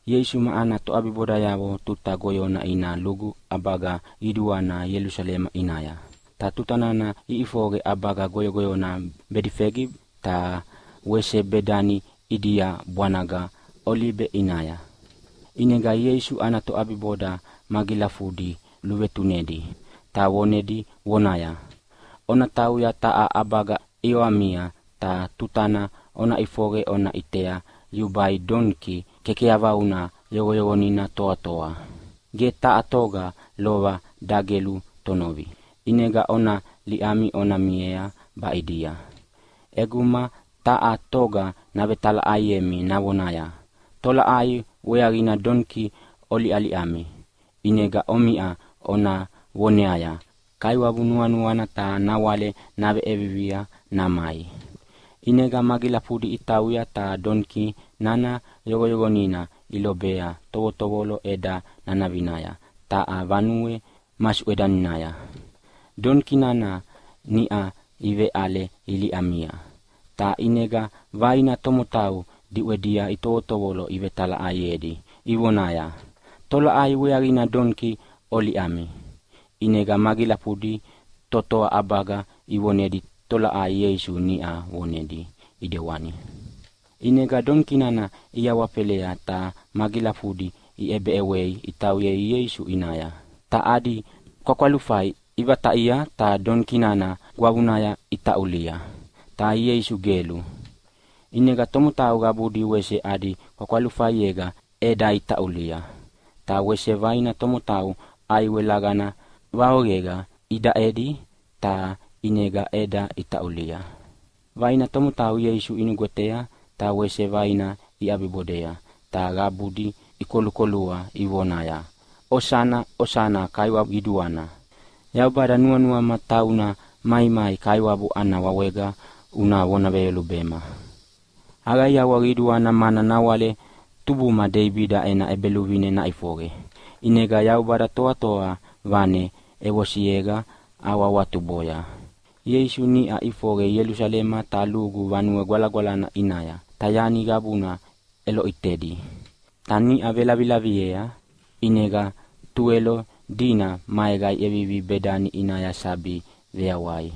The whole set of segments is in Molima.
Ieisu ma ana toʼabibodayavo tuta goyona ina lugu ʼabaga qiduana Ielusalema ʼinaya. Ta tutana iʼifoqe ʼabaga goyogoyona Bedifegi ta wese Bedani ʼidia bwanaga Olibe ʼinaya, ʼinega Ieisu ana toʼabiboda magilafudi luvetunedi, ta vonedi vonaya, “Ona tauya taha ʼabaga ʼiawamia ta tutana ona ʼifoqe ona ʼitea yubai doniki kekeyavauna yoqoyoqonina toatoa, ge taha toga lova dagelu tonovi. ʼInega ona liʼami ona miea baʼidia. ʼEguma taha toga navetalaʼaiemi navonaya, ‘Tolaʼai weaqina doniki oliʼaliʼami?’ ʼInega omiʼa ona voneaya, ‘Kaiwabu nuanuana ta nawale naveʼevivia namai.’” ʼInega magilafudi itauya ta doniki nana yoqoyoqonina ilobea tovotovolo ʼeda nanavinaya taha vanue masuʼedaninaya. Doniki nana niʼa iveʼale iliʼaliʼami, ta ʼinega vaina tomotau diʼwedia itovotovolo ivetalaʼaiedi ivonaya, “Tolaʼai weaqina doniki oliʼaliʼami?” ʼInega magilafudi totoa ʼabaga ivonedi tolaʼai Ieisu niʼa vonedi ʼidewani. ʼInega doniki nana iawafelea ta magilafudina iʼebeʼewei itauyea Ieisu ʼinaya. Ta adi kwakwalufai ivataʼia ta doniki nana gwavunaya itaʼulia, ta Ieisu gelu. ʼInega tomotau qabudi wese adi kwakwalufaiega ʼeda itaʼulia. Ta wese vaina tomotau ʼaiwe laqana vaoqega idaʼedi ta ʼinega ʼeda itaʼulia. Vaina tomotau Ieisu inugwetea ta wese vaina iʼabibodea, ta qabudi ikolukolua ivonaya, “Osana, osana! Kaiwa qiduana! Yaubada, nuanuama tauna maimai Kaiwabu ana wawega una vona veyolubea. Aqaiawa qiduana mana nawale tubuma Deibida ena ʼEbeluvine naʼifoqe. ʼInega Yaubada Toatoa Vanena ʼevosiega ahawahawatuboya.” Ieisu niʼa ʼifoqe Ielusalema ta lugu Vanue Gwalagwalana ʼinaya, ta yani qabuna ʼeloʼitedi. Ta niʼa velavilaviea ʼinega Tuwelo dina maega iʼevivi Bedani ʼinaya sabi veyawai.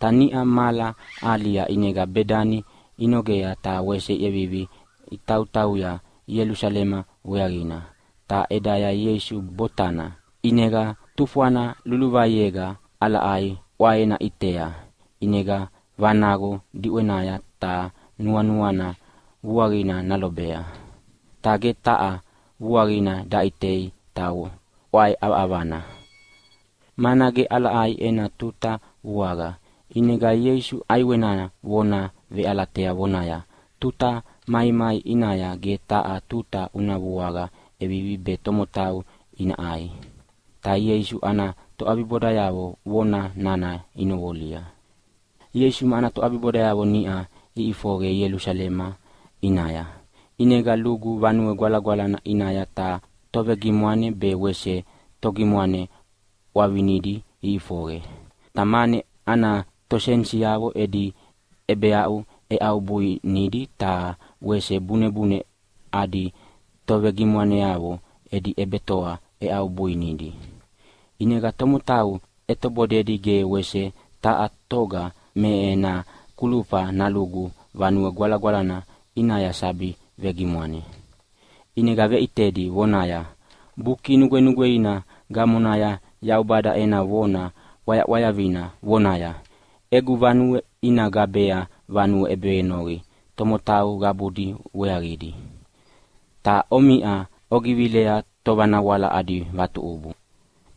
Ta niʼa mahala ahalia ʼinega Bedani inogea ta wese iʼevivi itautauya Ielusalema weaqina, ta ʼedaya Ieisu botana. ʼInega tufwana luluvaiega ʼalaʼai ʼwaena ʼitea, ʼinega vanaqo diʼwenaya ta nuanuana vuaqina nalobea. Ta ge taha vuaqina daʼitei ta ʼwae ʼavaʼavana, mana ge ʼalaʼai ena tuta vuaqa. ʼInega Ieisu ʼaiwena vona veʼalatea vonaya, “Tuta maimai ʼinaya ge taha tuta una vuaqa ʼevivi be tomotau ina ʼai.” Ta Ieisu ana toʼabibodayavo vona nana inoqolia. Ieisu ma ana toʼabibodayavo niʼa iʼifoqe Ielusalema ʼinaya. ʼInega lugu Vanue Gwalagwalana ʼinaya ta tovegimwane be wese togimwane ʼwavinidi iʼifoqe. Ta mane ana tosenisiavo edi ʼebeaʼu ʼeʼaubuinidi ta wese bunebune adi tovegimwaneavo edi ʼebetoa ʼeʼaubuinidi. ʼInega tomotau ʼetobodedi ge wese taha toga me ena kulufa nalugu Vanue Gwalagwalana ʼinaya sabi vegimwane. ʼInega veʼitedi vonaya, “Buki Nugwenugweina gamonaya Yaubada ena vona ʼwayaʼwayavina vonaya, ‘Egu vanue ina gabea vanue ʼebevenoqi tomotau qabudi weaqidi. Ta omiʼa ogivilea tovanawala adi vatuʼubu.’”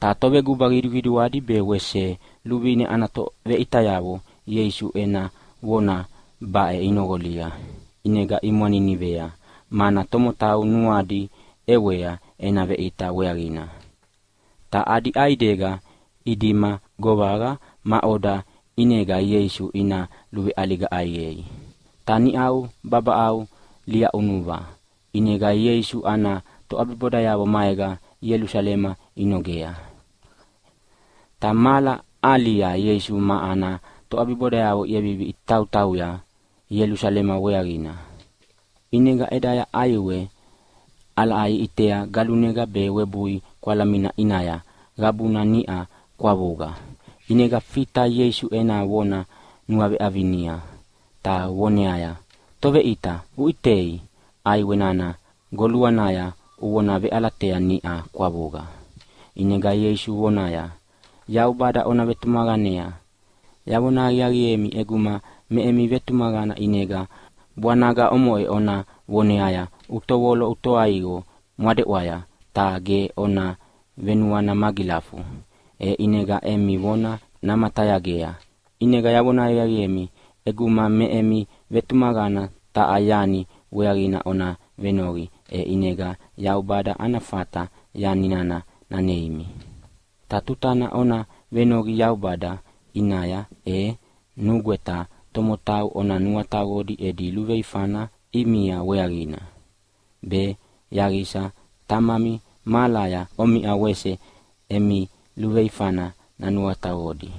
Ta toveguba qiduqiduadi be wese luvine ana toveʼitayavo Ieisu ena vona baʼe inoqolia, ʼinega imwaninivea, mana tomotau nuadi ʼewea ena veʼita weaqina. Ta adi ʼaidega idima govaqa maʼoda ʼinega Ieisu ina luveʼaliga ʼaiqei. Ta niʼau babaʼau liaʼunuva ʼinega Ieisu ana toʼabibodayavo maega Ielusalema inogea. Ta mahala ahalia Ieisu ma ana toʼabibodayavo iʼevivi itautauya Ielusalema weaqina. ʼInega ʼedaya ʼaiwe ʼalaʼai iʼitea galunega be webui kwalamina ʼinaya qabuna niʼa kwavuqa. ʼInega Fita Ieisu ena vona nuaveʼavinia ta voneaya, “Toveʼita, uʼitei! ʼAiwe nana goluanaya uvona veʼalatea niʼa kwavuqa!” ʼInega Ieisu voneaya, “Yaubada ona vetumaqanea! Yavona aqiaqiemi, ʼeguma me emi vetumaqana ʼinega bwanaga omoʼe ona voneaya, ‘Utovolo utoaiqo mwadeʼwaya!’ ta ge ona venuana magilafu, e ʼinega emi vona namatayagea. ʼInega yavona aqiaqiemi, ʼeguma me emi vetumaqana taha yani weaqina ona venoqi, e ʼinega Yaubada ana fata yani nana naneimi. Ta tutana ona venoqi Yaubada ʼinaya e nugweta tomotau ona nuataqodi edi luveifana ʼimia weaqina, be yaqisa Tamami mahalaya omiʼa wese emi luveifana nanuataqodi.”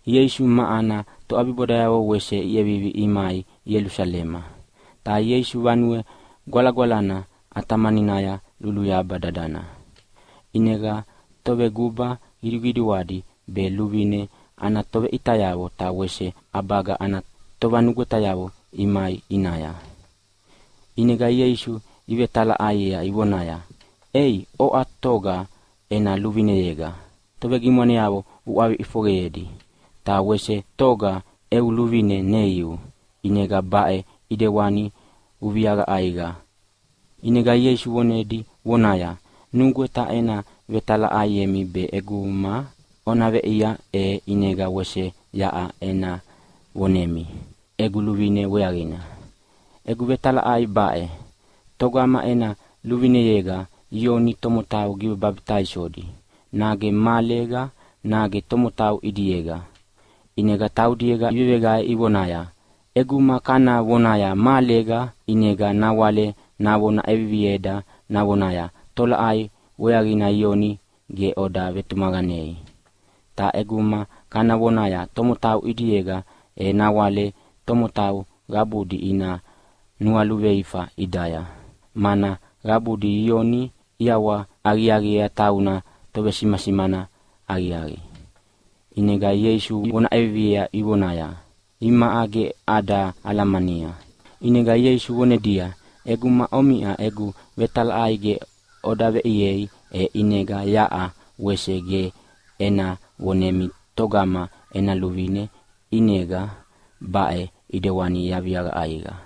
Ieisu ma ana toʼabibodayavo wese iʼevivi imai Ielusalema. Ta Ieisu Vanue Gwalagwalana ʼatamaninaya luluyaba dadana, ʼinega toveguba qiduqiduadi be luvine ana toveʼitayavo ta wese ʼabaga ana tovanugwetayavo imai ʼinaya. ʼInega Ieisu ivetalaʼaiea ivonaya, “Ei, oʼa toga ena luvineyega tovegimwaneavo uʼwavi ʼifoqeyedi? Ta wese togama eu luvine neiu ʼinega baʼe ʼidewana uviaviaqa ʼaiqa?” ʼInega Ieisu vonedi vonaya, “Nugweta ena vetalaʼaiemi be ʼeguma ona veʼiea, e ʼinega wese yaʼa ena vonemi egu luvine weaqina. Egu vetalaʼai baʼe, togama ena luvineyega Ioni tomotau givebabitaisodi, nage mahalega nage tomotau ʼidiega?” ʼInega taudiega iveveqae ivonaya, “ʼEguma kana vonaya, ‘Mahalega’, ʼinega nawale navona ʼevivieda navonaya, ‘Tolaʼai weaqina Ioni ge oda vetumaqanei?’ Ta ʼeguma kana vonaya, ‘Tomotau ʼidiega’, e nawale tomotau qabudi ina nualuveifa ʼidaya, mana qabudi Ioni iʼawahaqiaqiea tauna tovesimasimana aqiaqi.” ʼInega Ieisu ivona ʼeviviea ivonaya, “Imaʼa ge ada alamania.” ʼInega Ieisu vonedia, “ʼEguma omiʼa egu vetalaʼai ge oda veʼiei, e ʼinega yaʼa wese ge ena vonemi togama ena luvine ʼinega baʼe ʼidewani yaviaviaqa ʼaiqa.”